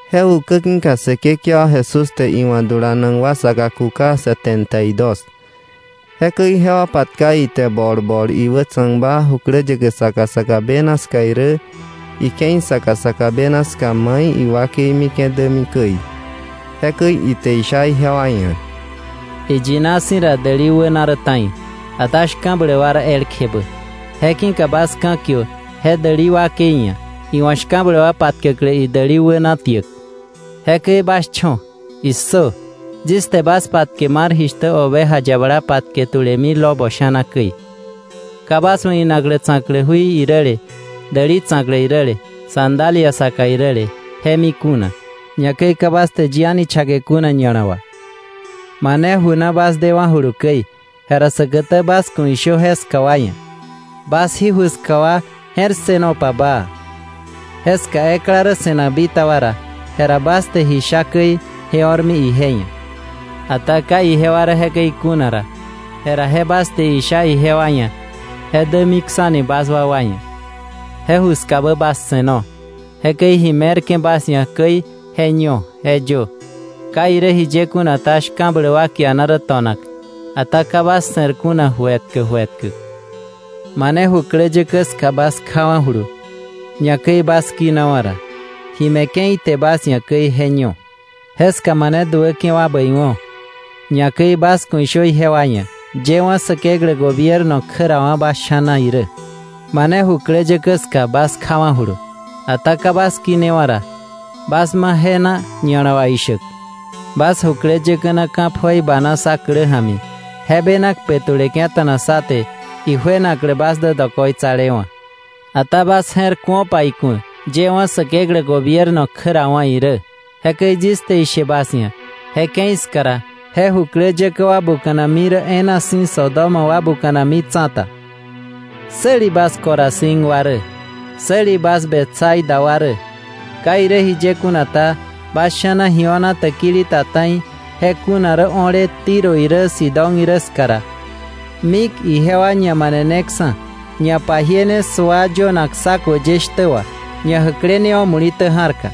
Je ukä ki̱ka Säkekewa Jesús te iwa̱ dulanak wa saka kuka setenta y dos. Jekäi jewa patka ite bol bol iwätsa̱kba jukläyäkä saka saka bena ska irä ike̱i saka saka bena ska mai iwakei mike̱ dämi käi. Jekäi ite isha ijewa ia̱: “Iyina si̱ ra, däli wäna rä ta̱i, ata shka̱bläk wa rä elkjebä. Je ki̱ka bas ka̱kiö je däli wakei ia̱ iwa̱ shka̱bläk wa patkäklä idäli wäna tiäk. Jekäi bas cho̱. ¡Issö! Yis te bas patke mar jishtä oveja yabala patke tulemi lobo sha̱na käi. Ka bas wa̱ inaklä tsa̱klä jui iräle, däli tsa̱klä iräle, sandalia saka iräle, je mi kuna, ñakäi ka bas te yi a̱ni chake kuna ña̱la wà. Mane ju na bas dewa̱julu käi, jera säkätä bas ku̱ ishö jeska wa ia̱: “Bas jí ju ska wa je̱r ssënopa baa.” Jeska ekla rä se̱nak bitaba ra, jera bas te ji sha käi je o̱rmi ije ia̱. Ata ka ijewa rä jekäi kuna ra, jera je bas te isha ijewa ia̱ je dämiksa̱ni bas wakwa ia̱. Je ju skabä bas se̱no, jekäi ji me̱rke̱ bas ia̱ käi je ño, je yö. Ka irä jiye kuna ta, shka̱bläk wa kiana rä to̱nak. Ata ka bas se̱r kuna ju etkä ju etkä. Mane jukläyäkä ska bas kjawa̱julu, ñakäi bas kinawa̱ ra, ji me̱ke̱ ite bas ia̱ käi, je ño. Jeska mane duäke̱ wa bäiwo̱, ñakäi bas ku̱ ishö ijewa ia̱: “Yëwa̱ Säkeklä gobierno kjärawa̱ bas sha̱na irä.” Mane jukläyäkä ska bas kjawa̱julu, ata ka bas kinewa̱ ra, bas ma je na ña̱la wà ishäk: ‘Bas jukläyäkä na ka̱ pjoi bana sá klä ja̱mi je bena kpe tuleke̱ta̱na sá te ijuenaklä bas dä dokoitsalewa̱. Ata bas je̱r ku̱opa iku̱ yëwa̱ Säkeklä gobierno kjärawa̱ irä.’ Jekäi yis te ishe bas ia̱, je ke̱i ska ra, je jukläyäkä wa buka̱nami rä e̱e̱na si̱ Sodoma wa buka̱nami tsa̱ta. “¡Säli bas Corazín wa rä! ¡Säli bas Betsaida wa rä! Ka irä jiye kuna ta, bas sha̱na ji o̱na täkili ta ta̱i je kuna rä o̱le Tiro irä Sidón irä ska ra, mik ijewa ñamaneneksa̱, ñapajiene sua yönak saco ye shtä wà, ñajäklenewa̱ muli̱tä ja̱rka.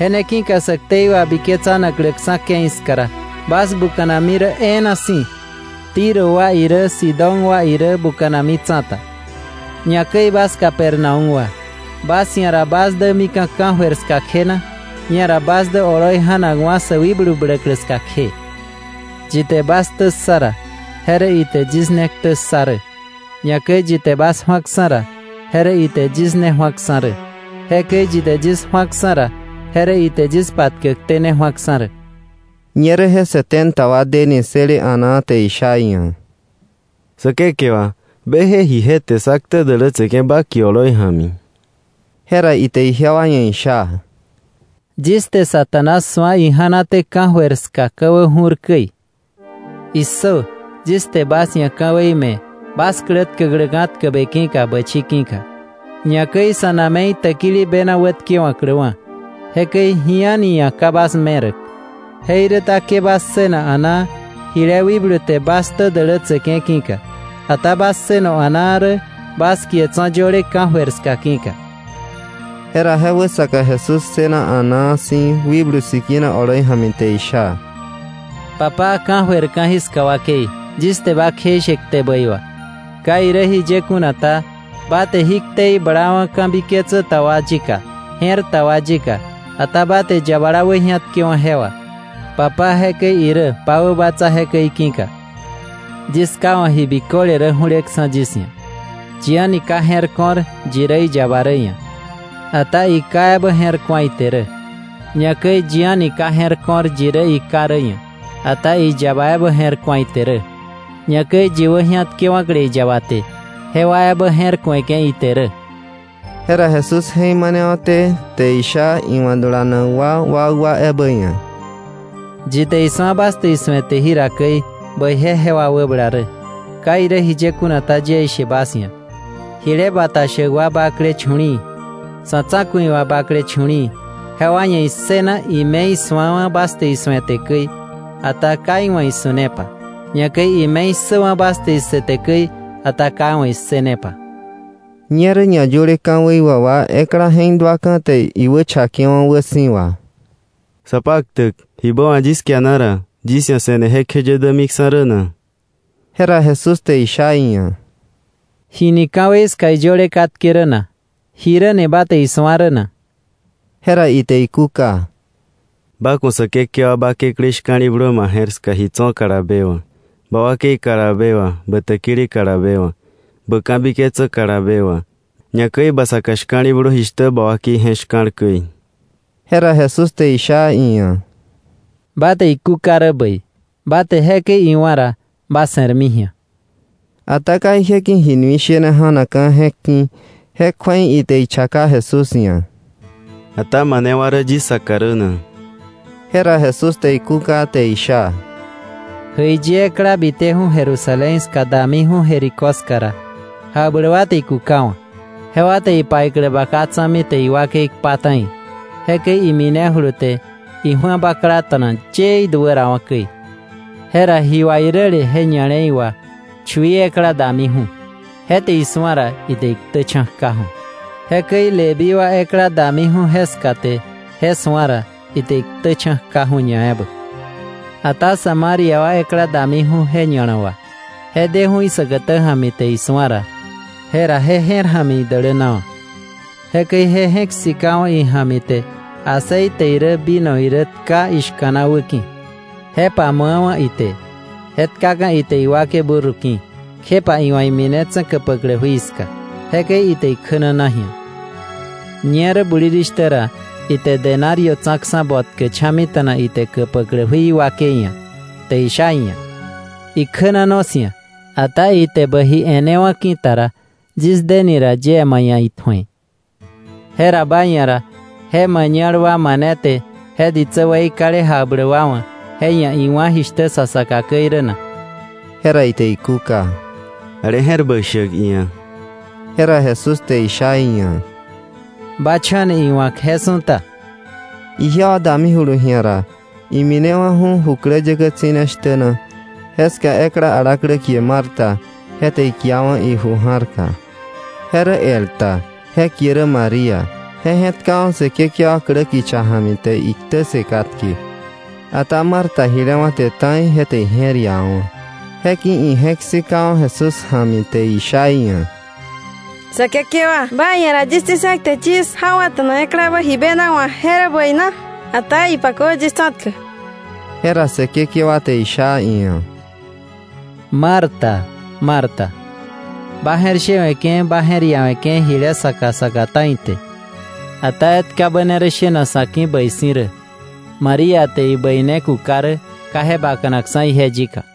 Je ne ki̱ka sä ktei wabiketsanakläksa̱ ke̱i ska ra, bas buka̱nami rä e̱e̱na si̱, Tiro wa irä Sidón wa irä buka̱nami tsa̱ta. Ñakäi bas Capernaúm wa, ¿bas ia̱ ra bas dämika̱ ka̱jöir ska kje na? Ñera bas dä oloi ja̱nakwa̱ sä wikblu bläklä ska kje. “Yi te bas ktä ssa ra, je rä ite yis ne ktä ssa rä; ñakäi yi te bas ju̱aksa̱ ra, je rä ite yis ne ju̱aksa̱ rä; jekäi yi te yis ju̱aksa̱ ra, je rä ite yis patkäkté ne ju̱aksa̱ rä.” Ñerä je setenta wa deni ssële a̱naa te isha iia̱: —Säkekewa, beje jije te sá ktä dälätseke̱ ba kie oloi ja̱mi. Jera ite ijewa ia̱ isha: —Yis te Satanás su̱a ija̱naté ka̱jöir ska ka̱wä ju̱r käi. ¡Issö! Yis te bas ia̱ ka̱wei me̱ bas klä tkäkläka̱ tkäbe ki̱ka bächi ki̱ka, ñakäi sa̱ na̱me̱i täkili bena wätkewa̱kläwa̱. Jekäi ji a̱ni ia̱ ka bas meräk. Jeiräta ke bas ssëna a̱naa jile wikblu te bas ktä dälätseke̱ ki̱ka, ata bas ssëno a̱naa rä bas kie tso̱ yöle ka̱jöir ska ki̱ka. Jera je wäsaka Jesús ssëna a̱naa si̱ Wikblu Sikina oloi ja̱mi te isha: “Papá, ka̱jöir ka̱jiska wakei, yis te ba kjeishe kte bäi wà. Ka irä jiye kuna ta, ba te jí ktei blawa̱ ka̱biketsä ta wa yika je̱r ta wa yika, ata ba te yabala wäji̱atkewa̱ je wà. Papá, jekäi irä, ba wäbatsa jekäi ki̱ka. “Yis Ká wa̱ ji biköle rä ju̱leksa̱ yis ia̱. Yi a̱ni ka je̱r ko̱r yi rä iyaba rä ia̱, ata iKá ebä je̱r ku̱a ite rä. Ñakäi yi a̱ni ka je̱r ko̱r yi rä iKá rä ia̱, ata iyaba ebä je̱r ku̱a ite rä, ñakäi yi wäji̱atkewa̱kle iyaba te, jewa ebä je̱r ku̱eke̱ ite rä.” Jera Jesús je̱k manewa̱té te isha iwa̱ dulanak wa wakwa ebä ia̱: “Yi te isu̱a bas te isu̱ete jira käi, bäije jewa wäbala rä. Ka irä jiye kuna ta, yie ishe bas ia̱, jile bata shäk wa bakle chu̱li̱i̱, sa̱ tsa̱ku̱i wa bakle chu̱li̱i̱ jewa ia̱ issëna ime isu̱awa̱ bas te isu̱ete käi, ata ka iwa̱ isu̱nepa; ñakäi ime issäwa̱ bas te issëte käi, ata ka iwa̱ issënepa.” Ñerä ñayöle ka̱wei wà ekla je̱k duaka̱ te iwächakewa̱ wäsi̱wa: —Sapaktäk, ¿jibä wa̱k yis kiana ra, yis ia̱ se̱ne jekjeye dämiksa̱ rä na? Jera Jesús te isha iia̱: —¿Ji ni ka̱wei ska iyöle katke rä na? ¿Jiräni ba te isu̱a rä na? Jera ite ikúka: —Ba ku̱ Säkekewa ba Kekläí shka̱li̱blö ma je̱r ska ji tso̱ kalabe wà, ba wakei kalabe wà, bä täkili kalabe wà, bä ka̱biketsä kalabe wà; ñakäi ba saka shka̱li̱blö jishtä ba wakei je̱k shka̱l käi. Jera Jesús te isha iia̱: —Ba te ikúka rä bäi. Ba te iwa̱ jekäi ra, ba se̱rmi ji̱a. Ata ka ije ki̱ ji nui shene ja̱nakka̱ je̱k ki̱, je kju̱ei ite ichaka Jesús ia̱: —¿Ata manewa rä yis saka rä na? Jera Jesús te ikúka te isha: —Jäiyi ekla biteju̱ Jerusalén ska damiju̱ Jericó ska ra, jakbläk wa te ikukawa̱. Jewa te ipaiklä baka tsa̱mi te iwakei kpa ta̱i, jekäi iminejulu te iju̱a baklata̱na yee iduärawa̱ käi. Jera ji wà iräle je ña̱le̱i wà chui ekla damiju̱. Je te je su̱a ra, ite iktächa̱ kjaju̱. Jekäi Leví wa ekla damiju̱ jeska te je su̱a ra, ite iktächa̱ kjaju̱ ñaebä. Ata Samaria wa ekla damiju̱ je ña̱la wà. Je deju̱ isäkätä ja̱mi te isu̱a ra, jera je je̱r ja̱mi idälänawa̱. Jekäi je je̱k sikawa̱ ija̱mi te aceite irä vino irä tka ishka̱na wäki̱, je pamu̱awa̱ ite, je tkaka̱ ite iwakei burro ki̱, kjepa iwa̱ iminetse̱ käpäklä jui ska. Jekäi ite ikjänana ji̱a. Ñerä bulirishtä ra ite denario tsa̱ksa̱ botkä cha̱mita̱na ite käpäklä jui wakei ia̱ te isha iia̱: “Ikjänano 'sia̱. Ata ite bä ji e̱newa̱ ki̱ta ra, yis deni ra yie ma ia̱ itju̱e.” Jera ba ia̱ ra ¿je mañal wa mane te je ditsä weikale jakbläk wa wa̱ je ia̱ iwá̱ jishtä sa saka käi rä na? Jera ite ikúka: —Ale je̱r bäi shäk iia̱. Jera Jesús te isha iia̱: —Ba cho̱ni iwa̱k je su̱ta. Ijewa damijulu ji̱a ra, iminewa̱ju̱ jukläyäkä tsi̱ne shtä na. Jeska ekla alaklä kie Marta, je te ikiawa̱ iju ja̱rka. Je rä el ta je kie rä María. Je je̱tkawa̱ Säkekewa klä kicha ja̱mi te iktä ssë katke. Ata Marta jile wa̱te ta̱i je te ije̱r iawa̱wa̱. Je ki̱ ije̱k sikawa̱ Jesús ja̱mi te isha iia̱: —Säkekewa, ba ia̱ ra yis tsi̱se̱k te yis jawa̱ta̱na eklabä ji bena wa̱k ¿je rä bäi na? Ata ipakö yis tsa̱tkäk. Jera Säkekewa te sha iia̱: —Marta, Marta, ba je̱r shewe̱ke̱ ba je̱r iawe̱ke̱ jile saka saka ta̱i te, ata etkabä ne rä shenak sa̱ ki̱ bäi si̱ rä. María te ibäi ne kuka rä, ka je bakanakksa̱ ije yika.